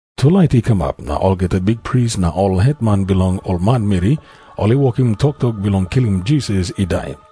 Tulait i kamap, na olgeta bikpris na ol hetman bilong ol manmeri ol i wokim toktok bilong kilim Jisas i dai.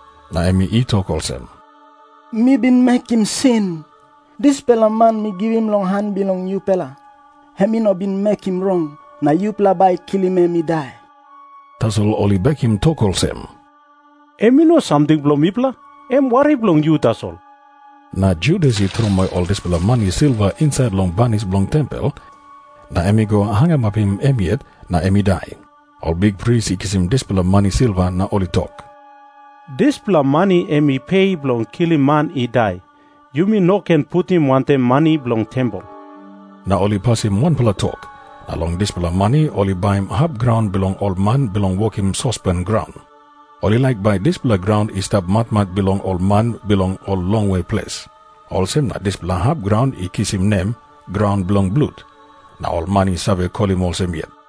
Na em i tok olsem, "Mi bin mekim sin. Dispela man mi givim long han bilong yupela, em i no bin mekim rong. Na yupela bai i kilim em i dai." Tasol ol i bekim tok olsem, "Em i no samting bilong mipela. Em wari bilong yu tasol." Na Judas i tromoi ol dispela mani silva insait long banis bilong tempel, na em i go hangamapim em yet na em i dai. Ol bikpris i kisim dispela mani silva, na ol i tok, "Dispela mani em i pe bilong kilim man i dai. Yumi no ken putim wantaim mani bilong tempel." Na ol i pasim wanpela tok, na long dispela mani ol i baim hap graun bilong ol man bilong wokim sospen graun. Ol i laik bai dispela graun i stap matmat bilong ol man bilong ol longwe ples. Olsem na dispela hap graun i kisim nem, Graun Bilong Blut, na ol man i save kolim olsem yet.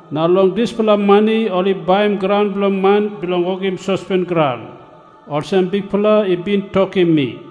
Na long dispela mani ol i baim graun bilong man bilong wokim sospen graun, olsem Bikpela i bin tokim mi."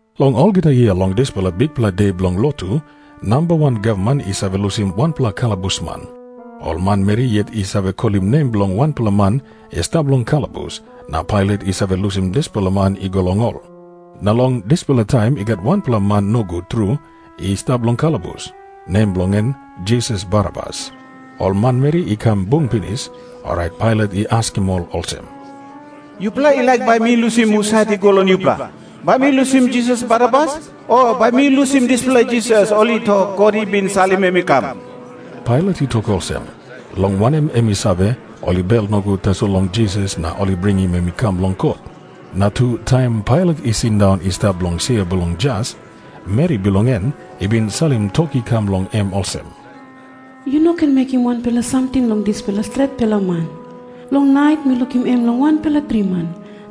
Long olgeta yia long dispela bikpela de bilong lotu, namba wan gavman i save lusim wanpela kalabusman. Ol manmeri yet i save kolim nem bilong wanpela man i stap long kalabus, na Pailat i save lusim dispela man i go long ol. Na long dispela taim i gat wanpela man nogut tru i stap long kalabus, nem bilong en Jisas Barabas. Ol manmeri i kam bung pinis, orait Pailat i askim ol olsem, "Yupela i laik bai mi lusim husat i go long yupela? Bai mi lusim Jisas Barabas, o bai mi lusim dispela Jisas ol i tok God i bin salim em i kam?" Pailat i tok olsem, long wanem, em i save, ol i bel nogut tasol long Jisas, na ol i bringim em i kam long kot. Na tu, taim Pailat i sindaun i stap long sia bilong jas, meri bilong en i bin salim tok i kam long em olsem, "Yu no ken mekim wanpela samting long dispela stretpela man. Long nait mi lukim em long wanpela driman,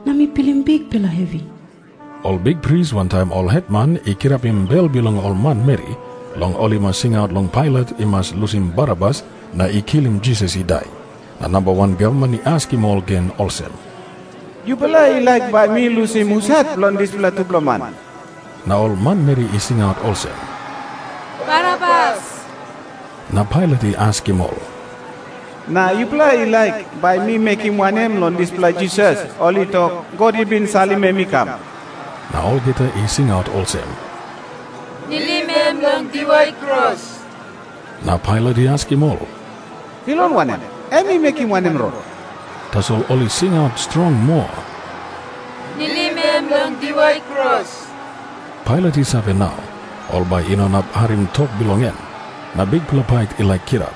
na mi pilim bikpela hevi." Ol bikpris wantaim ol hetman i kirapim bel bilong ol manmeri, long ol i mas singaut long Pailat i mas lusim Barabas na i kilim Jisas i dai. Na namba wan gavman i askim ol gen olsem, "Yupela i laik bai mi lusim husat bilong dispela tupela man?" Na ol manmeri i singaut olsem, "Barabas." Na Pailat i askim ol, "Na yupela i laik bai mi mekim wanem long dispela Jisas ol i tok God i bin salim em i kam?" Na olgeta i singaut olsem, "Nilim em long diwai kros." Na Pailat i askim ol, "Bilong wanem? Em i mekim wanem rong?" Tasol ol i singaut strong moa, "Nilim em long diwai kros." Pailat i save nau, ol bai i no inap harim tok bilong en, na bikpela pait i laik kirap.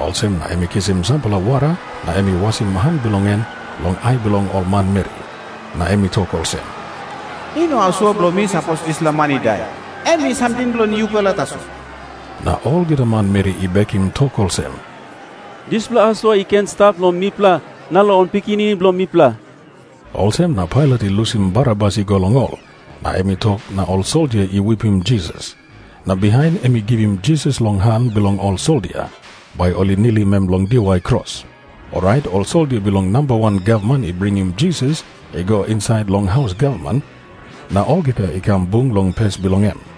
Olsem na em i kisim sampela wara na em i wasim han bilong en long ai bilong ol manmeri. Na em i tok olsem, "I no asua bilong mi sapos dispela man i dai. Em i samting bilong yupela tasol." Na olgeta manmeri i bekim tok olsem, "Dispela asua i ken i stap long mipela na long ol pikinini bilong mipela." Olsem na Pailat i lusim Barabas i go long ol. Na em i tok na ol soldia i wipim Jisas. Na bihain em i givim Jisas long han bilong ol soldia, bai ol i nilim em long diwai kros. Orait ol soldia bilong namba wan gavman i bringim Jisas i go insait long haus gavman, na olgeta i kam bung long pes bilong em.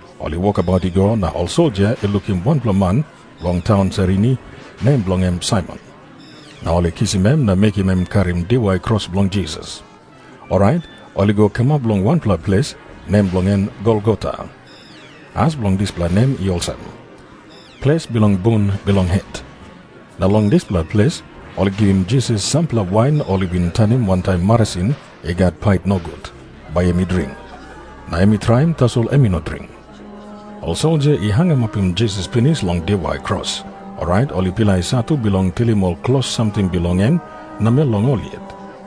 Ol i wokabaut i go, na ol soldia i lukim wanpela man bilong taun Sairini, nem bilong en Saimon. Na ol i kisim em na mekim em i karim diwai kros bilong Jisas. Orait ol i go kamap long wanpela ples, nem bilong en Golgota. As bilong dispela nem i olsem, Ples bilong bun bilong het. Na long dispela ples ol i givim Jisas sampela wain ol i bin tanim wantaim marasin i gat pait nogut, bai em i dring. Na em i traim, tasol em i no dring. Ol soldia i hangamapim Jisas pinis long diwai kros, orait ol i pilai satu bilong tilim ol klos samting bilong en namel long ol yet. …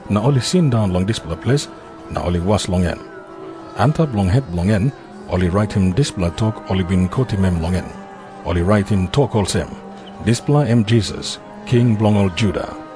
Na ol i sindaun long dispela ples, na ol i was long em. Antap long het bilong en ol i raitim dispela tok ol i bin kotim em long en. Ol i raitim tok olsem, "Dispela em Jisas, King bilong ol Juda."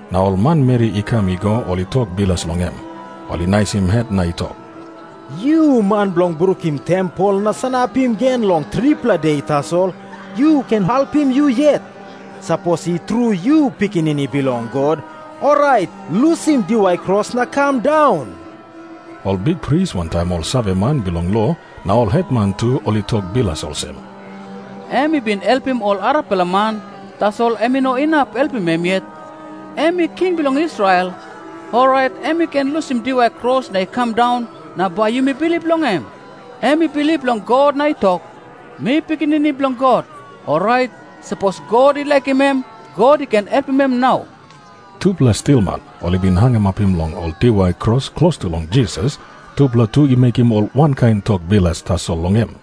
Na ol manmeri i kam i go, ol i tok bilas long em. Ol i naisim het na i tok, "Yu man bilong brukim tempel na sanapim gen long tripela de tasol, yu ken helpim yu yet. Sapos i tru yu Pikinini Bilong God, orait lusim diwai kros na kam daun." Ol bikpris wantaim ol saveman bilong lo na ol hetman tu ol i tok bilas olsem, "Em i bin helpim ol arapela man, tasol em i no inap helpim em yet. Em i king bilong Israel. Orait em i ken lusim diwai kros na i kam daun, na bai yumi bilip long em. Em i bilip long God na i tok, 'Mi Pikinini Bilong God.' Orait, sapos God i laikim em, God i ken helpim em nau." Tupela stilman ol i bin hangamapim long ol diwai kros klostu long Jisas, tupela tu i mekim ol wankain tok bilas tasol long em.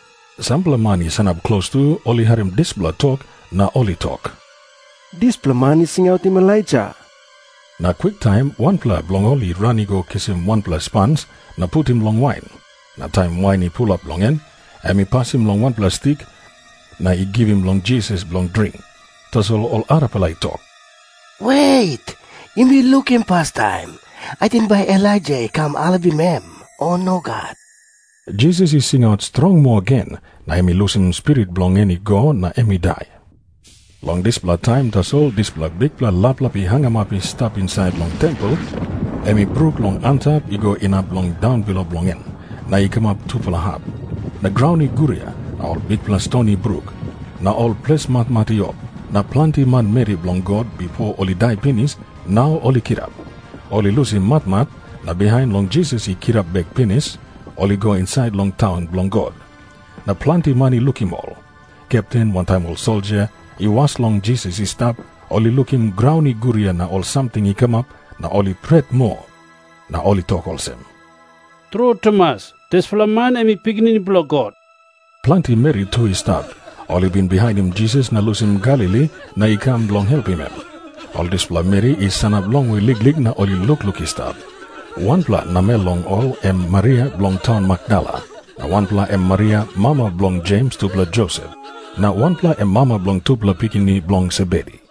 Sampela man i sanap klostu, ol i harim dispela tok, na ol i tok, "Dispela man i singautim Elaija." Na kwiktaim wanpela bilong ol i ran i go kisim wanpela spans na putim long wain. Na taim wain i pulap long en, em i pasim long wanpela stik na i givim long Jisas bilong dring. Tasol ol arapela i tok, "Wet, yumi lukim pastaim. Ating bai Elaija i kam helpim em, o nogat?" Jisas i singaut strong moa gen, na em i lusim spirit bilong en i go na em i dai. Long dispela taim tasol dispela bikpela laplap i hangamap i stap insait long tempel em i bruk long antap i go inap long daunbilo bilong en, na i kamap tupela hap. Na graun i guria, na ol bikpela ston i bruk. Na ol ples matmat i op, na planti manmeri bilong God, bipo ol i dai pinis, nau ol i kirap. Ol i lusim matmat, na bihain long Jisas i kirap bek pinis, ol i go insait long taun bilong God. Na planti man i lukim ol. Kepten wantaim ol soldia i was long Jisas i stap, ol i lukim graun i guria na ol samting i kamap, na ol i pret moa. Na ol i tok olsem, "Tru tumas, dispela man em i Pikinini Bilong God." Planti meri tu i stap, ol i bin bihainim Jisas na i lusim Galili na i kam bilong helpim em. Ol dispela meri i sanap longwe liklik na ol i lukluk i stap. Wanpela namel long ol em Maria bilong taun Makdala. Na wanpela em Maria, mama bilong Jems tupela Josep. Na wanpela em mama bilong tupela pikinini bilong Sebedi.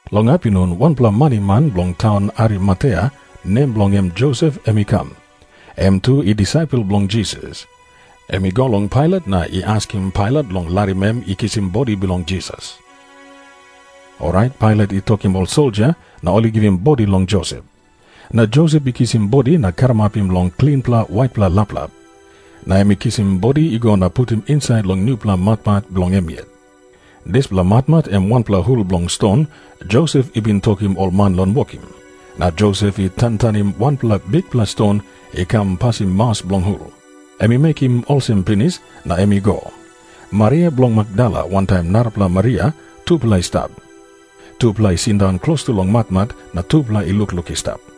Long apinun wanpela maniman bilong taun Arimatea, nem bilong en Josep, em i kam. Em tu i disaipel bilong Jisas. Em i go long Pailat na i askim Pailat long larim em i kisim bodi bilong Jisas. Orait Pailat i tokim ol soldia na ol i givim bodi long Josep. Na Josep i kisim bodi na i karamapim long klinpela waitpela laplap. Na em i kisim bodi i go na putim insait long nupela matmat bilong em yet. Dispela matmat em wanpela hul bilong ston Josep i bin tokim ol man long wokim. Na Josep i tantanim wanpela bikpela ston i kam pasim maus bilong hul. Em i mekim olsem pinis, na em i go. Maria bilong Makdala wantaim narapela Maria, tupela i stap. Tupela i sindaun klostu long matmat, na tupela i lukluk i stap.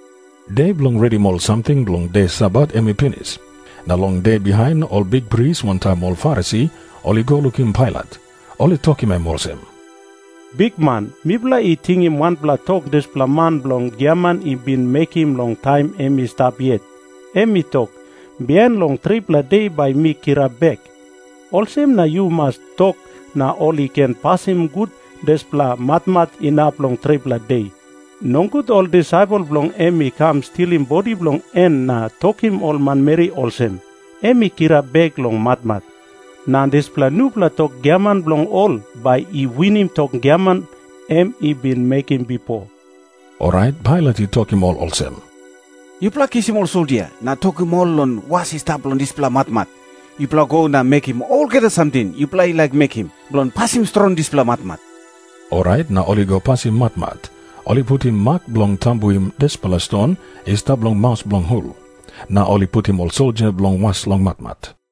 De bilong redim ol samting bilong de Sabat em i pinis, na long de bihain, ol bikpris wantaim ol Farisi ol i go lukim Pailat. Ol i tokim em olsem, "Bikman, mipela i tingim wanpela tok dispela man bilong giaman i bin mekim long taim em i stap yet. Em i tok, 'Bihain long tripela de bai mi kirap bek.' Olsem na yu mas tok na ol i ken pasim gut dispela matmat inap long tripela de. Nogut ol disaipel bilong en i kam stilim bodi bilong en na tokim ol manmeri olsem, 'Em i kirap bek long matmat.' Na dispela nupela tok giaman bilong ol bai i winim tok giaman em i bin mekim bipo." Orait Pailat i tokim ol olsem, "Yupela kisim ol soldia na tokim ol long was i stap long dispela matmat. Yupela go na mekim olgeta samting yupela i laik mekim bilong pasim strong dispela matmat." Orait na ol i go pasim matmat. Ol i putim mak bilong tambuim dispela ston i stap long maus bilong hul, na ol i putim ol soldia bilong was long matmat.